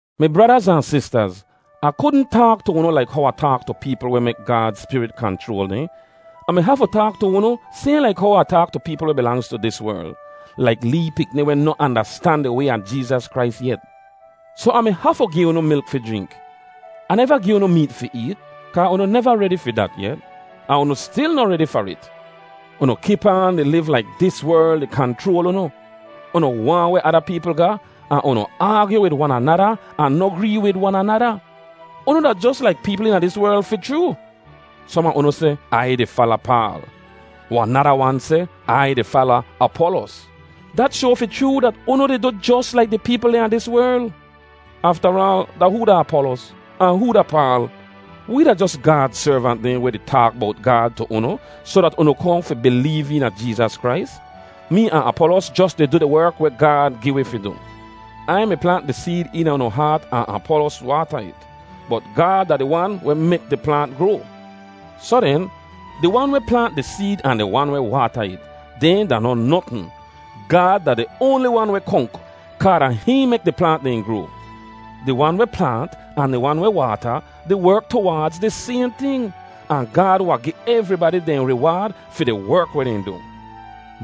Mi bradaz ahn sistaz, Ah kudn taak tu unu laik how Ah taak tu peepl weh mek Gaad Spirit kanchroal dehn. Ah mi hafu taak tu unu sayhn laik how Ah taak tu peepl weh bilangz tu dis werl, laik lee pikni weh noh andastan di way a Jeezas Krais yet. Soh Ah mi hafu gi unu milk fi jrink. Ah neva gi unu meet fi eet, kaa unu neva redi fi dat yet. Ahn unu stil noh redi far it. Unu kip aan di liv laik dis werl di kanchroal unu. Unu waahn weh ada peepl ga ahn unu aagyu wid wan anada ahn noh gree wid wan anada. Unu da jos laik peepl eena dis werl fi chroo. Som a unu seh, “Ai di fala Paal.” Wahn nada wan seh, “Ai di fala Apolos.” Dat shoa fi chroo dat unu di du jos laik di peepl dehn a dis werl. Aftaraal, da hoo da Apolos? Ahn hoo da Paal? Wee da jos Gaad servant dehn weh di taak bowt Gaad tu unu soh dat unu kohn fi bileev eena Jeezas Krais. Mee ahn Apolos jos di du di werk weh Gaad gi wi fi du. Ai mi plaant di seed eena unu haat ahn Apolos waata it, bot Gaad da di Wan weh mek di plaant groa. Soh den, di wan weh plaant di seed ahn di wan weh waata it, dehn da noh notn. Gaad da di oanli wan weh konk, kaa da hihn mek di plaant dehn groa. Di wan weh plaant ahn di wan weh waata, di werk tuwaadz di sayhn ting. Ahn Gaad wahn gi evribadi dehn riwaad fi di werk weh dehn du.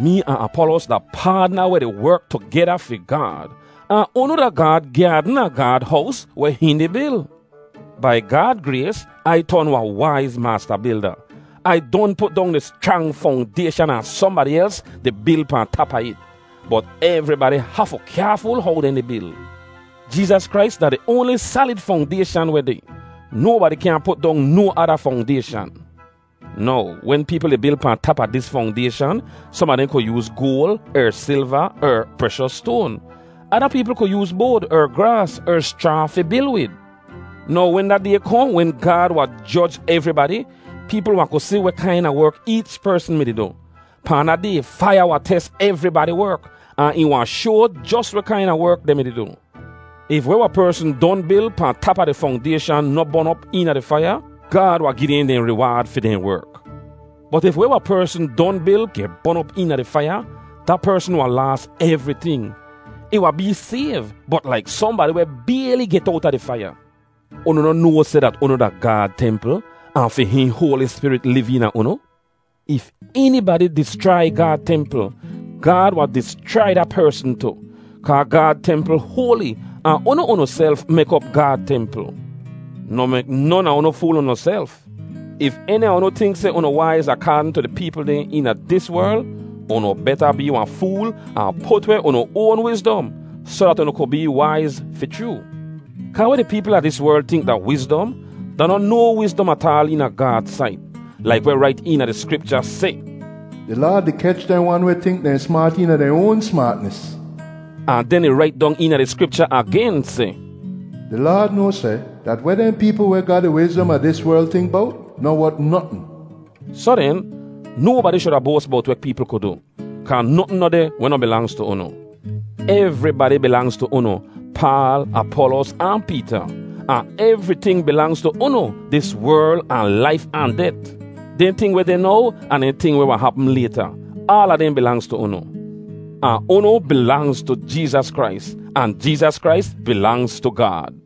Mee ahn Apolos da paadna weh di werk tugeda fi Gaad. Ahn unu da Gaad gyaadn ahn Gaad hows weh hihn di bil. Bai Gaad grays Ai ton wahn waiz maasta bilda. Ai don put dong di schrang fongdayshan ahn sohnbadi els di bil pahn tap a it. Bot evribadi hafu kyaaful how dehn di bil. Jeezas Krais da di oanli salid fongdayshan weh deh. Nobadi kyaahn put dong no ada fongdayshan. Now, wen peepl di bil pahn tap a dis fongdayshan, som a dehn ku yooz goal, er silva er preshos stoan. Ada peepl ku yooz boad, er graas, er schraa fi bil wid. Now wen da Day kohn wen Gaad wahn joj evribadi, peepl wahn ku si weh kaina werk eech persn mi-di du. Pahn da Day faiya wahn tes evribadi werk, ahn ih wahn shoa jos weh kaina werk dehn mi-di du. If weh wahn persn don bil pahn tap a di fongdayshan noh bon op eena di faiya, Gaad wahn gi dehn dehn riwaad fi dehn werk. Bot if weh wahn persn don bil geh bon op eena di faiya, da persn wahn laas evriting. Ih wahn bee sayv, bot laik sohnbadi weh bayli get owta di faiya. Unu noh noa seh dat unu da Gaad templ, ahn fi hihn Hoali Spirit liv eena unu? If enibadi dischrai Gaad templ, Gaad wahn dischrai da persn tu. Kaa Gaad templ hoali ahn unu unuself mek op Gaad templ. Noh mek non a unu fool unuself. If eni a unu tink seh unu waiz akaadn tu di peepl dehn eena dis werl, unu beta bee wahn fool ahn put weh unu oan wizdom soh dat unu ku bee waiz fi chroo. Kaa weh di peepl a dis werl tink da wizdom, da noh no wizdom ataal eena Gaad sait. Laik weh rait eena di Skripcha seh, “Di Laad di kech dehn wan weh tink dehn smaat eena dehn oan smaatnis.” Ahn den ih rait dong eena di Skripcha agen seh, “Di Laad noa seh dat weh dehn peepl weh ga di wizdom a dis werl tink bowt noh wot notn.” Soh den, nobadi shuda boas bowt weh peepl ku du, kaa notn noh deh weh noh bilangz tu unu. Evribadi bilangz tu unu—Paal, Apolos, ahn Peeta. Ahn evriting bilangz tu unu—dis werl, ahn laif ahn det; dehn ting weh deh now, ahn dehn ting weh wahn hapm layta—aala dehn bilangz tu unu. Ahn unu bilangz tu Jeezas Krais, ahn Jeezas Krais bilangz tu Gaad.